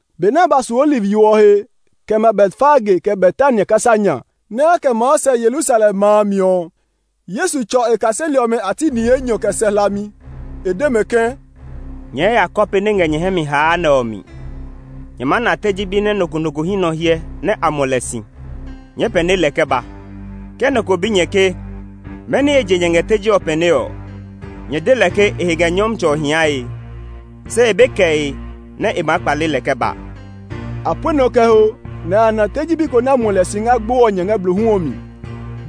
Benɛ a ba su Oliv yo ɔ he, kɛ ma Betfage kɛ Betania kasa nya, nɛ a kɛ maa sɛ Yerusalem ma a mi ɔ, Yesu tsɔ e kaseli ɔmɛ a ti ni enyɔ kɛ sɛ hlami. E de mɛ ke, “Nyɛɛ ya kɔpe nɛ ngɛ nyɛ hɛ mi haa nɛ ɔ mi. Nyɛɛ maa na teji bi nɛ nɔ ko nɔ ko hí nɔ hyɛ nɛ a muɔ lɛ si. Nyɛɛ pɛne lɛ kɛ ba. Ke nɔ ko bi nyɛ ke, mɛni he je nyɛ ngɛ teji ɔ pɛnee ɔ, nyɛ de lɛ ke e he ngɛ Nyɔmtsɛ ɔ hiae, se e be kɛe nɛ e maa kpale lɛ kɛ ba.” A pue nɔ kɛ ho, nɛ a ya na teji bi ko nɛ a muɔ si ngɛ agbo ɔ nya ngɛ blohu ɔ mi.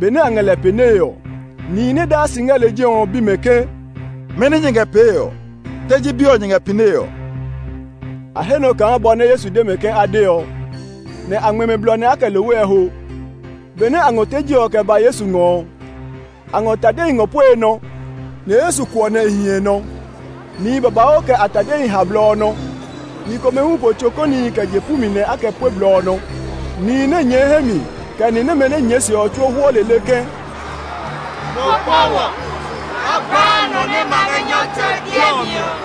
Benɛ a ngɛ lɛ pɛnee ɔ, nihi nɛ daa si ngɛ lejɛ ɔ bi mɛ ke, “Mɛni nyɛ ngɛ pee ɔ? Teji bi ɔ nyɛ ngɛ pɛnee ɔ?” A he nɔ kaa bɔ nɛ Yesu de mɛ ke a de ɔ; nɛ a ngmɛ mɛ blɔ nɛ a kɛ lohwe ɔ ho. Benɛ a ngɔ teji ɔ kɛ ba Yesu ngɔ ɔ, a ngɔ tadehi ngɔ pue e nɔ, nɛ Yesu kuɔ nɛ ɛ hi nɔ. Nihi babauu kɛ a tadehi ha blɔ ɔ nɔ. Ni komɛ hu po tso kɔnihi kɛ je pu mi nɛ a kɛ pue blɔ ɔ nɔ. Nihi nɛ nyɛɛ hɛ mi, kɛ ni nɛmɛ nɛ nyɛɛ e se ɔ tsuo hwɔ lele ke, “Mo kpɔ wɔ! A gbaa nɔ nɛ ma ngɛ Nyɔmtsɛ ɔ biɛ mi ɔ!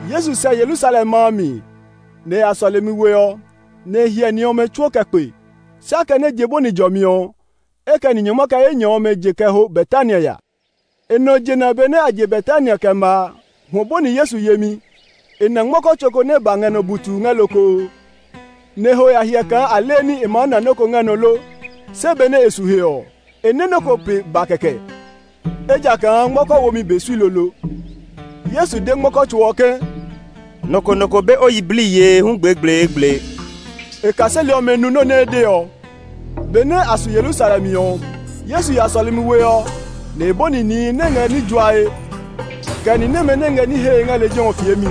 Yesu sɛ Yerusalem ma a mi, nɛ e ya sɔlemi we ɔ, nɛ e hyɛ ní ɔmɛ tsuo kɛ kpe, se akɛnɛ je bɔni jɔmi ɔ, e kɛ ni nyɔngma kɛ enyɔ ɔmɛ je kɛ ho Betania ya. E nɔ jena benɛ a je Betania kɛ ma a, hwɔ bɔni Yesu yemi. E na ngmɔkɔ tso nɛ ba ngɛ nɔ butuu ngɛ lokoo, nɛ e ho ya hyɛ kaa alini e ma ná nɔ́ ko ngɛ nɔ lo. Se benɛ e su he ɔ, e nɛ́ nɔ́ ja nɔ́ ko pe ba kɛkɛ, ejakaa ngmɔkɔ womi be sui lolo. Yesu de ngmɔkɔ tso ɔ ke, “Nɔ ko nɔ ko be o yiblii yee hu gblegbleegble!” E kaseli ɔmɛ nu nɔ́ nɛ e de ɔ. Benɛ a su Yerusalem ɔ, Yesu ya sɔlemi we ɔ, nɛ e bɔni nihi nɛ ngɛ ní juae, kɛ ni nɛmɛ nɛ ngɛ ní hee ngɛ lejɛ ɔ fiemi.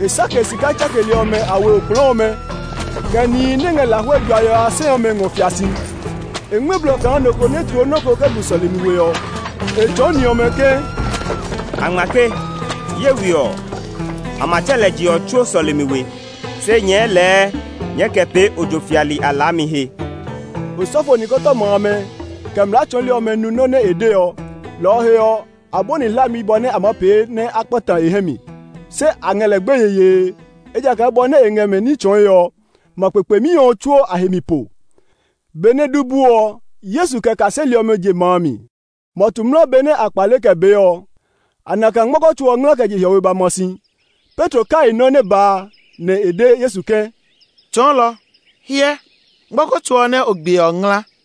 E sake sika tsakeli ɔmɛ a we okplɔɔ ɔmɛ, kɛ nihi nɛ ngɛ lahuɛ juae ɔ a sɛ ɔmɛ ngɔ fia si. E ngmɛ́ blɔ kaa nɔ ko nɛ tloo nɔ́ ko kɛ gu sɔlemi we ɔ. E tsɔɔ ni ɔmɛ ke, “A ngma ke, ‘Ye we ɔ, a ma tsɛ lɛ je ɔ tsuo sɔlemi we’. Se nyɛɛ lɛɛ nyɛɛ kɛ pee ojo fiali a laami he!” Osɔfo nikɔtɔma amɛ, kɛ mlaa tsɔɔli ɔmɛ nu nɔ́ nɛ e de ɔ, lɔ ɔ he ɔ, a bɔni hlami bɔ nɛ a maa pee nɛ a kpata e hɛ mi. Se a ngɛ lɛ gbeye yee, ejakaa bɔ nɛ e ngɛ mɛ ní tsɔɔe ɔ, ma kpekpemi ɔ tsuo a he mi po. Benɛ du bu ɔ, Yesu kɛ e kaseli ɔmɛ je ma a mi. Mɔtu mla benɛ a kpale kɛ bee ɔ, a na kaa ngmɔkɔ tso ɔ ngla kɛ je hiɔwe ba ma si. Petro kai nɔ́ nɛ ba a, nɛ e de Yesu ke, “Tsɔɔlɔ, hyɛ, ngmɔkɔ tso ɔ nɛ o gbiɛ ɔ ngla!”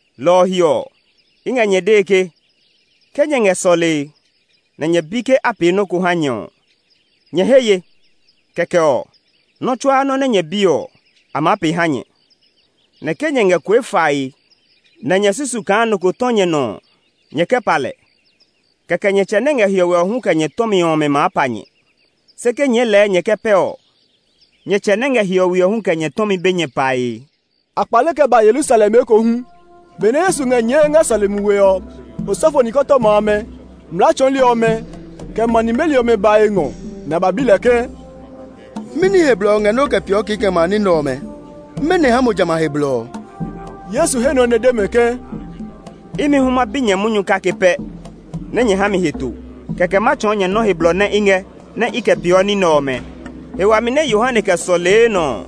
Lɔ ɔ he ɔ, i ngɛ nyɛ dee ke, ke nyɛ ngɛ sɔlee, nɛ nyɛ bi ke a pee nɔ́ ko ha nyɛ ɔ, nyɛ he ye; kɛkɛ ɔ, nɔ́ tsuaa nɔ́ nɛ nyɛ bi ɔ, a maa pee ha nyɛ. Nɛ ke nyɛ ngɛ kue fae nɛ nyɛ susu kaa nɔ ko tɔ nyɛ nɔ ɔ, nyɛ kɛ pa lɛ, kɛkɛ nyɛ tsɛ nɛ ngɛ hiɔwe ɔ hu kɛ nyɛ tɔmi ɔmɛ maa pa nyɛ. [ “Se ke nyɛɛ lɛɛ nyɛ kɛ pɛ ɔ, nyɛ tsɛ nɛ ngɛ hiɔwe ɔ hu kɛ nyɛ tɔmi be nyɛ pae.”] A kpale kɛ ba Yerusalem ekohu. Benɛ Yesu ngɛ nyɛɛe ngɛ sɔlemi we ɔ, osɔfo nikɔtɔma amɛ, mlaa tsɔɔli ɔmɛ, kɛ ma nimeli ɔmɛ ba e ngɔ, nɛ a ba bi lɛ ke, “Mɛni he blɔ o ngɛ nɛ o kɛ peeɔ kikɛmɛ a ní nɛ ɔmɛ? Mɛnɔ ha mo jamɛ a he blɔ ɔ?” Yesu he nɔ nɛ e de mɛ ke, “Imi hu ma bi nyɛ munyu kake pɛ nɛ nyɛ ha mi heto, kɛkɛ ma tsɔɔ nyɛ nɔ́ he blɔ nɛ i ngɛ nɛ i kɛ peeɔ ní nɛ ɔmɛ. He wami nɛ Yohane kɛ sɔlee nɔ ɔ,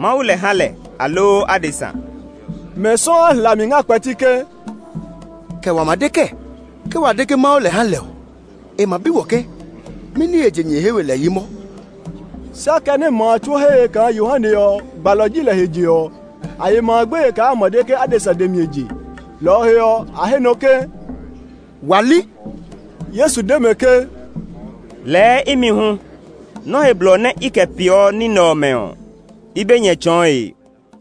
Mawu lɛ ha lɛ, aloo adesa?” Mɛ sɔuu a hlami ngɛ a kpɛti ke, “Kɛ wa ma de kɛɛ? Ke wa de ke Mawu lɛ ha lɛ ɔ, e ma bi wɔ ke, ‘Mɛni he je nyɛ he we lɛ yi mɔ?’” Se akɛnɛ ma a tsuo he ye kaa Yohane ɔ, gbalɔ ji lɛ he je ɔ, a ye ma a gbeye kaa a ma de ke adesa dɛ mi e je. Lɔ ɔ he ɔ, a he nɔ ke, “Wa li.” Yesu de mɛ ke, “Lɛɛ imi hu nɔ nɛ ha mi he blɔ nɛ i kɛ peeɔ ní nɛ ɔmɛ ɔ, i be nyɛ tsɔɔe.”